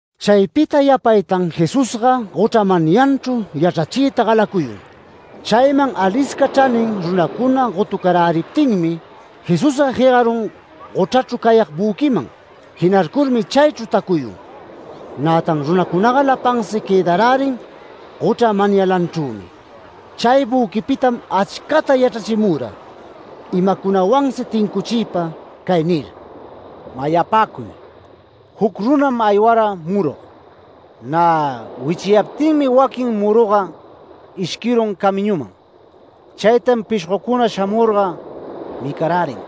Chaypita yapaytan Jesusga gochra manyanchru yachrachiyta galacuyun. Chayman alisca chranin runacuna gotucaräriptinmi, Jesusga jegarun gochrachru cayag büquiman. Jinarcurmi chaychru tacuyun. Nätan runacunaga lapansi quëdarärin gochra manyalanchrümi. Chay büquipitam achcata yachrachimura, imacunawansi tincuchiypa, cay nir: “Mayapäcuy. Juc runam aywara murug. Nä wichiyaptinmi waquin muruga ishquirun camiñuman. Chaytam pishgocuna shamurga micarärin.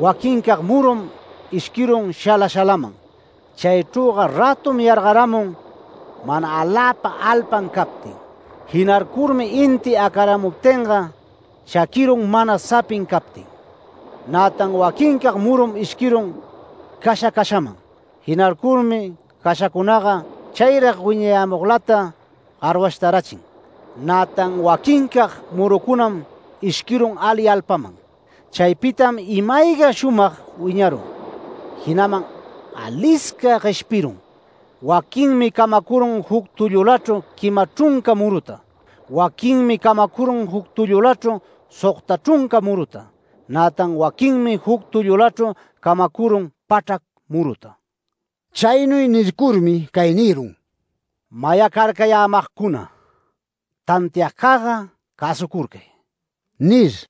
Waquincag murum ishquirun shala shalaman. Chaychrüga rätum yargaramun mana aläpa alpan captin. Jinarcurmi inti acaramuptinga chaquirun mana sapin captin. Nätan waquincag murum ishquirun casha cashaman. Jinarcurmi cashacunaga chayrag wiñayämuglata garwashtarachin. Nätan waquincag murucunam ishquirun ali alpaman. Chaypitam ima-ayga shumag wiñarun, jinaman alisca gueshpirun. Waquinmi camacurun juc tullulachru quima chrunca muruta. Waquinmi camacurun juc tullulachru sogta chrunca muruta. Nätan waquinmi juc tullulachru camacurun pachrac muruta”. Chaynuy nircurmi cay nirun: “Mayacarcayämagcuna, tantiagcagga cäsucurcay” nir.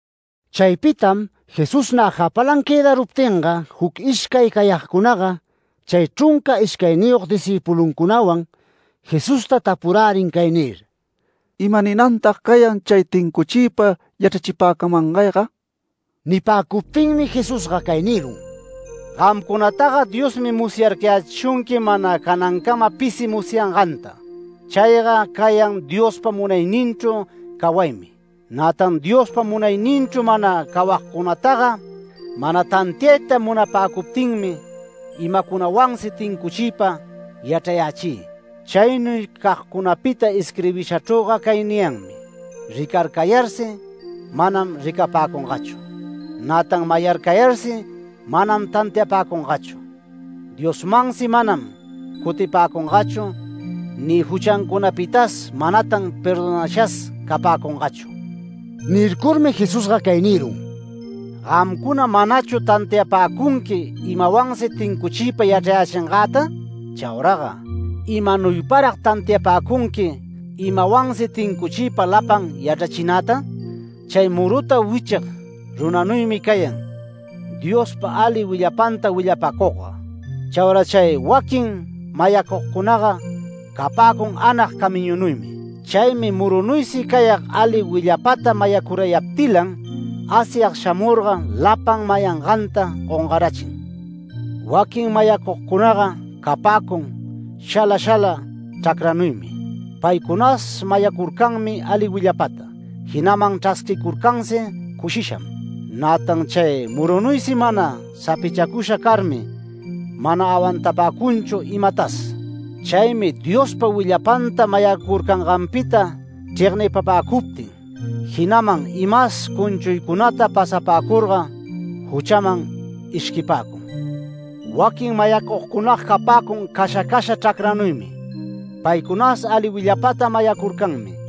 Chaypitam Jesús nä japalan quëdaruptinga, juc ishcay cayagcunaga chay chrunca ishcayniyog discïpuluncunawan, Jesusta tapurärin cay nir: “¿Imaninantag cayan chay tincuchiypa yachrachipäcamangayga?” Nipäcuptinmi Jesusga cay nirun: “Gamcunataga Diosmi musyarcayächishunqui mana canancama pisi musyanganta. Chayga cayan Diospa munayninchru cawaymi. Nätan Diospa munayninchru mana cawagcunataga mana tantiayta munapäcuptinmi imacunawansi tincuchiypa yachrayächï. Chaynuy cagcunapita isquirbishachrüga cay niyanmi: Rircararcayarsi manam ricapapäcungachu. Nätan mayarcayarsi manam tantiapäcungachu, Diosmansi manam cutipäcungachu, ni juchancunapitas manatan perdonashas capäcungachu”. Nircurmi Jesusga cay nirun: “¿Gamcuna manachu tantiapäcunqui imawansi tincuchiypa yachrayächingäta? Chauraga ¿imanuyparag tantiapäcunqui imawansi tincuchiypa lapan yachrachinata?” “Chay muruta wichig runanuymi cayan, Diospa ali willapanta willapacugga. Chaura chay waquin mayacugcunaga capäcun anag camiñunuymi. Chaymi murunuysi cayag ali willapata mayacurayaptilan, Asyag shamurga lapan mayanganta gongarachin. Waquin mayacugcunaga capäcun shala shala chracranuymi. Paycunas mayacurcanmi ali willapata, jinaman chrasquicurcansi cushisham. Nätan chay murunuysi mana sapichacusha carmi mana awantapäcunchu imatas. Chaymi Diospa willapanta mayacurcanganpita chregnipapäcuptin, jinaman imas cunchuycunata pasapäcurga, juchaman ishquipäcun. Waquin mayacugcunaga capäcun casha casha chracranuymi. Paycunas ali willapata mayacurcanmi.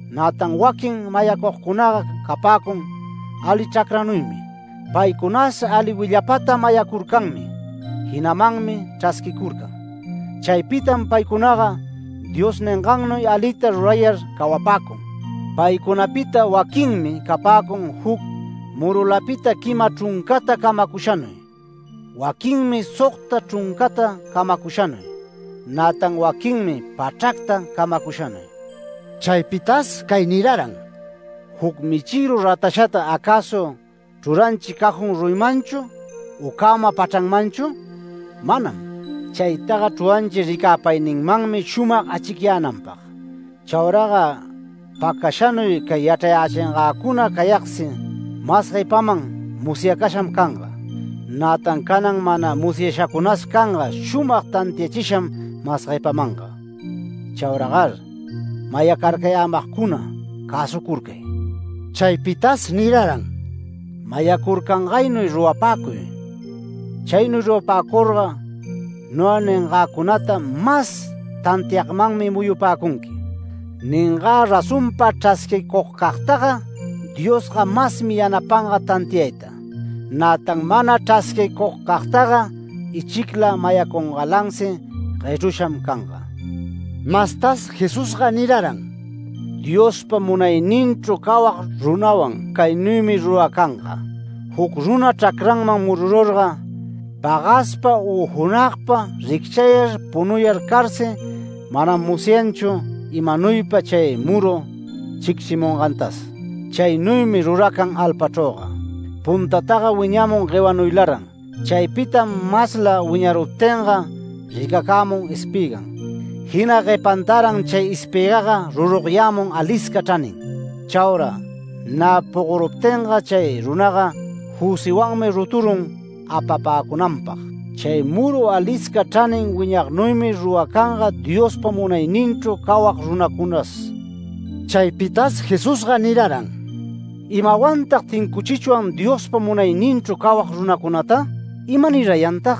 Nätan waquin mayacugcunaga capäcun ali chracranuymi. Paycunas ali willapata mayacurcanmi, jinamanmi chrasquicurcan. Chaypitam paycunaga Dios ningannuy alita rurayar cawapäcun. Paycunapita waquinmi capäcun juc murulapita quima chruncata camacushanuy, waquinmi sogta chruncata camacushanuy, nätan waquinmi pachracta camacushanuy”. Chaypitas cay niraran: “¿Juc michïru ratashata acäsu chruranchi cajón ruyimanchu u cäma pachranmanchu? Manam. Chaytaga chruranchi ricäpayninmanmi shumag achicyänanpag. Chauraga pacashanuy cay yachrachingäcuna cayagsi mas guepaman musyacasham canga. Nätan canan mana musyashacunas canga shumag tantiachisham mas guepamanga. Chauragar mayacarcayämagcuna cäsucurcay”. Chaypitas niraran: “Mayacurcangaynuy rurapäcuy. Chaynuy rurapäcurga noga ningäcunata mas tantiagmanmi muyupäcunqui. Ningä razonpa chrasquicugcagtaga Diosga masmi yanapanga tantiayta. Nätan mana chrasquicugcagtaga ichicla mayacungalansi guechrusham canga”. Mastas Jesusga niraran: “Diospa munayninchru cawag runawan caynuymi ruracanga: Juc runa chracranman murururga, pagaspa u junagpa, ricchayar punuyar carsi, manam musyanchu imanuypa chay muru chicchimungantas. Chaynuymi ruracan alpachrüga: Puntataga wiñamun guewanuylaran. Chaypitam masla wiñaruptinga ricacämun espïgan, jina guepantaran chay espïgaga rurugyämun alisca chranin. Chaura nä pogoruptinga chay runaga jüsiwanmi ruturun apapäcunanpag”. Chay muru alisca chranin wiñagnuymi rurapäcunga Diospa munayninchru cawag runacunas. Chaypitas Jesusga niraran: “¿Imawantag tincuchichwan Diospa munayninchru cawag runacunata? ¿Imanirayantag?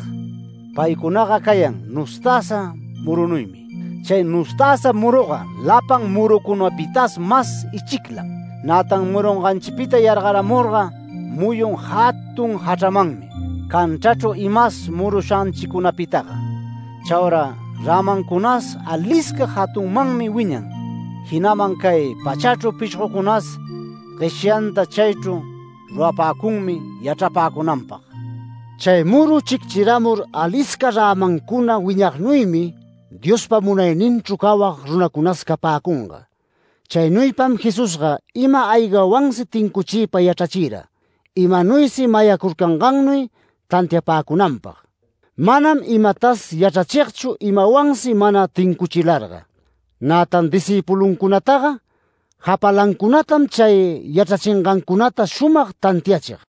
Paycunaga cayan nustäsa murunuymi. Chay nustäsa muruga lapan murucunapitas mas ichiclam. Nätan murunganchipita yargaramurga muyun jatun jachramanmi, canchrachru imas murushanchicunapitaga. Chaura rämancunas alisca jatunmanmi wiñan, jinaman cay pachachru pishgocunas gueshanta chaychru rurapäcunmi yachrapäcunanpag”. Chay muru chicchiramur alisca rämancuna wiñagnuymi Diospa munayninchru cawag runacunas capäcunga. Chaynuypam Jesusga ima-aygawansi tincuchiypa yachrachira, imanuysi mayacurcangannuy tantiapäcunanpag. Manam imatas yachrachigchu imawansi mana tincuchilarga. Nätan discïpuluncunataga japalancunatam chay yachrachingancunata shumag tantiachig.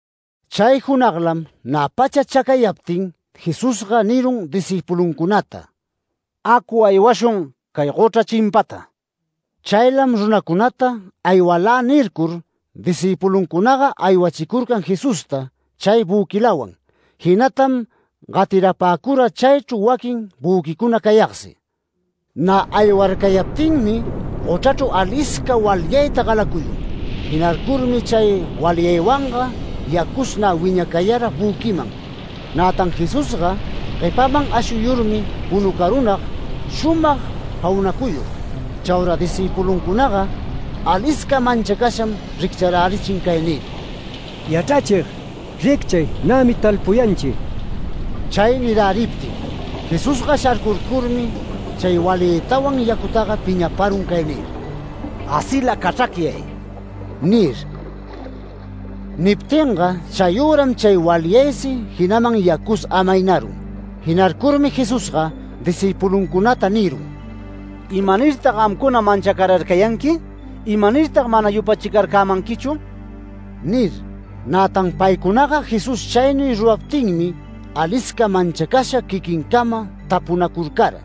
Chay junaglam nä pacha chacayaptin Jesusga nirun discïpuluncunata: “Acu, aywashun cay gochra chimpata”. Chaylam runacunata “Aywalä” nircur, discïpuluncunaga aywachicurcan Jesusta chay büquilawan. Jinatam gatirapäcura chaychru waquin büquicuna cayagsi. Nä aywarcayaptinmi gochrachru alisca walyayta galacuyun. Jinarcurmi chay walyaywanga yacus nä wiñacayara büquiman. Nätan Jesusga guepaman ashuyurmi punucarunag shumag jaunacuyur. Chaura discïpuluncunaga alisca manchacasham riccharärichin cay nir: “¡Yachrachig! ¡Ricchay, nämi talpuyanchi!” Chay niräriptin Jesusga sharcurcurmi chay walyaytawan yacutaga piñaparun cay nir: “¡Gasila cachracyay!” nir. Niptinga chayüram chay walyaysi, jinaman yacus amaynarun. Jinarcurmi Jesusga discïpuluncunata nirun: “¿Imanirtag gamcuna manchacararcayanqui? ¿Imanirtag mana yupachicarcämanquichu?” nir. Nätan paycunaga Jesús chaynuy ruraptinmi alisca manchacasha quiquincama tapunacurcara: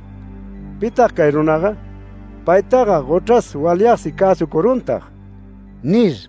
“¿Pitag cay runaga? ¿Paytaga gochras walyagsi cäsucuruntag?” nir.